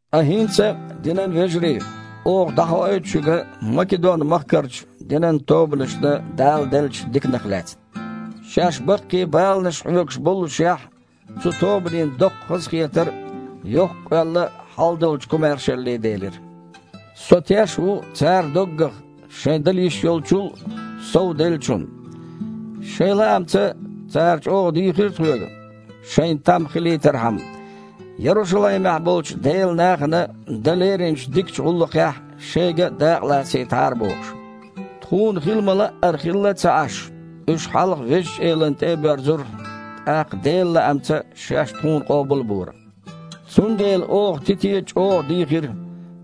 Ткъа хІинца, динан вежарий, оха дІахоуьйту шуьга Македон-махкарчу динан тобанашна Дала деллачу диканах лаьцна. Шаьш баккхий баланаш хьоьгуш боллушехь, цу тобанийн доккха хазахетар а, йоккха къоьлла а хьалдолчу комаьршалле делира. Со теш ву цара доггах, шайн дала йиш йолччул а, сов а деллачунна. Шайн лаамца цара чІогІа дийхира тхоьга, шайна там хилийтархьама, Ярушалаймехь болчу Делан нахана дан леринчу дикачу гІуллакхехь шайга а дакъалацийтахьара бохуш. Тхуна хила ма-лаъара хилла а ца Іаш, уьш хьалха Везачу Элана тІе а боьрзура, тІаккха Делан лаамца шаьш тхуна къобал а бора. Цундела оха Тите чІогІа дийхира,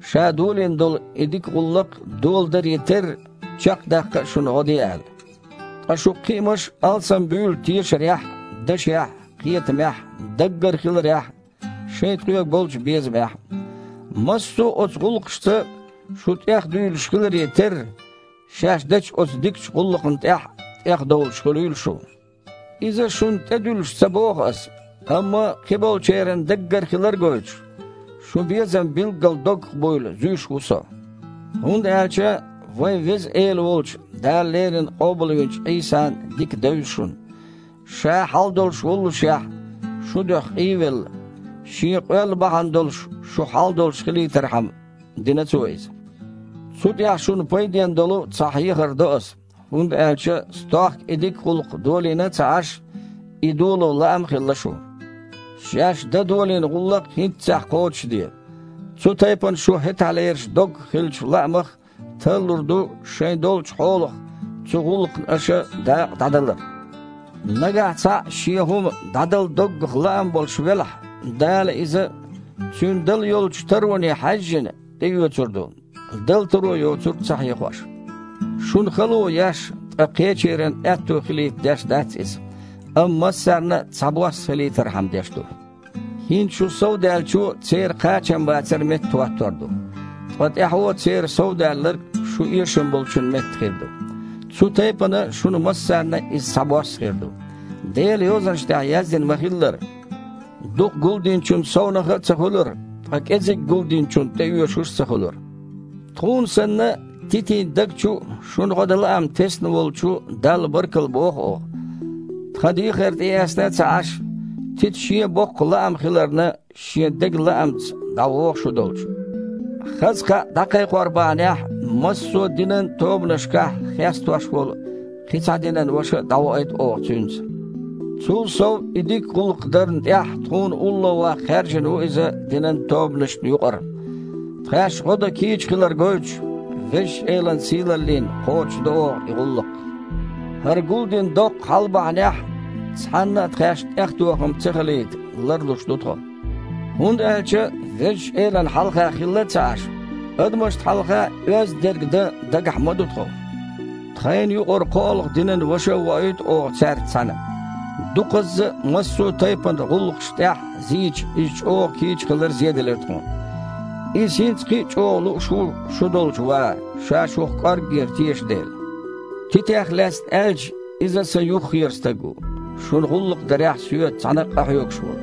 ша долийна долу и дика гІуллакх доладаре терра, чекхдаккха а шуна гІо де аьлла. Ткъа шун кхиамаш алсамбуьйлу тешарехь а, дашехь а, кхетамехь а, даггара хиларехь а, шайн тхоьга болчу безамехь а. Массо а оцу гІуллакхашца шу тІехдуьйлуш хиларе терра, шаьш дечу оцу дикачу гІуллакхна тІехь а тІехдовлуш хуьлийла шу. Иза шуна тІедуьллуш ца боху аса, амма, кхиболчеран даггара хилар а гойтуш, шун безам билггал доггах буйла зуьйш ву со. ХІунда аьлча вайн Веза Эла волчу, Дала леррина къобалвинчу Іийсан дика девза шуна. Ша хьал долуш воллушехь, шун дуьхьа къий а велла, Шен къоьлла бахьана долуш шу хьал долуш хилийтархьама, дина Цо иза. Цу тІехь шуна пайденна долу цхьа хьехар до аса, хІунда аьлча стохка и дика гІуллакх долийна а ца Іаш, и доло лаам а хилла шун. Шаьш дан долийна гІуллакх хІинццехь кхочушде. Цу тайпана шун хІетахьлерчу доггах хиллачу лаамах тарлур ду шайн долчу хьолах цу гІуллакхна аша дакъа дІадалар. Нагахь цхьаъ шен хІума дІадала доггах лаам болуш велахь, Дала иза, цуьнан дала йолчу тароне хьаьжжина, тІеоьцур ду, дала таро йоцург ца хьехош. Шуна хало еш, ткъа кхечеран аьтто хилийта деш дац иза, амма массарна а цхьабосса хилийтархьама деш ду. ХІинца шун совдаьллачо церан кхачамбацар меттахІоттор ду. Ткъа тІаьхьо церан совдаьлларг шун эшам болчун метта хир ду. Цу тайпана шуна массарна а иза цхьабосса хир ду. Делан Йозанаш тІехь яздина ма-хиллара: «Дукха гулдиначун совнаха а ца хуьлура, ткъа кІезиг гулдиначунна тІеоьшуш а ца хуьлура». Тхуна санна, Титин даг чу а шуна гІо дан лаам тесна волчу Далла баркалла боху оха. Тхан дехар тІеэцна а ца Іаш, Тита, шен а боккха лаам хиларна, шен деган лаамца дІавогІу шу долчу. Хаза кхаъ дІакхайкхор бахьанехь, массо а динан тобанашкахь хестош волу кхин а цхьа динан ваша дІавоуьйту оха цуьнца. Цул сов, и дика гІуллакх дарна тІехь тхуна улловаккха хаьржина ву иза динан тобанашна юкъара. Тхаьш гІо дан кийча хилар гойтуш, Везачу Элан сийлаллина кхочушдо оха и гІуллакх. ХІара гулдина доккха хьал бахьанехь, цхьаннан а тхаьшна тІехтохам ца хилийта ларлуш ду тхо. ХІунда аьлча Везачу Элана хьалха хилла а ца Іаш, адамашна хьалха а оьзда дерг дан дагахь ма ду тхо. Тхайна юкъара кхоолгІа динан ваша а воуьйту оха цаьрца цхьаьна. Дукхазза а массо а тайпана гІуллакхашна тІехь зийча, иза чІогІа кийча хилар зеделира тхуна. Иза хІинца кхин а чІогІа лууш ву шу долчу ван, ша шух кІорггера теша дела. Титех лаьцна аьлча – иза сан юххера стаг ву, шуна гІуллакх дарехь соьца цхьаьна къахьоьгуш волу.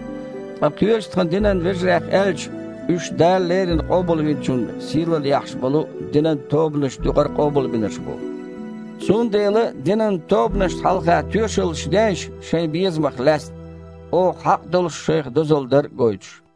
Ткъа кхечу тхан динан вежарех аьлча – уьш Дала леррина Къобалвинчунна сийлалла яхьаш болу динан тобанашна юкъара къобалбинарш бу. Цундела динан тобанашна хьалха тоьшаллаш дейша шайн безамах лаьцна, оха хьакъ долуш шайх дозалла дар а гойтуш.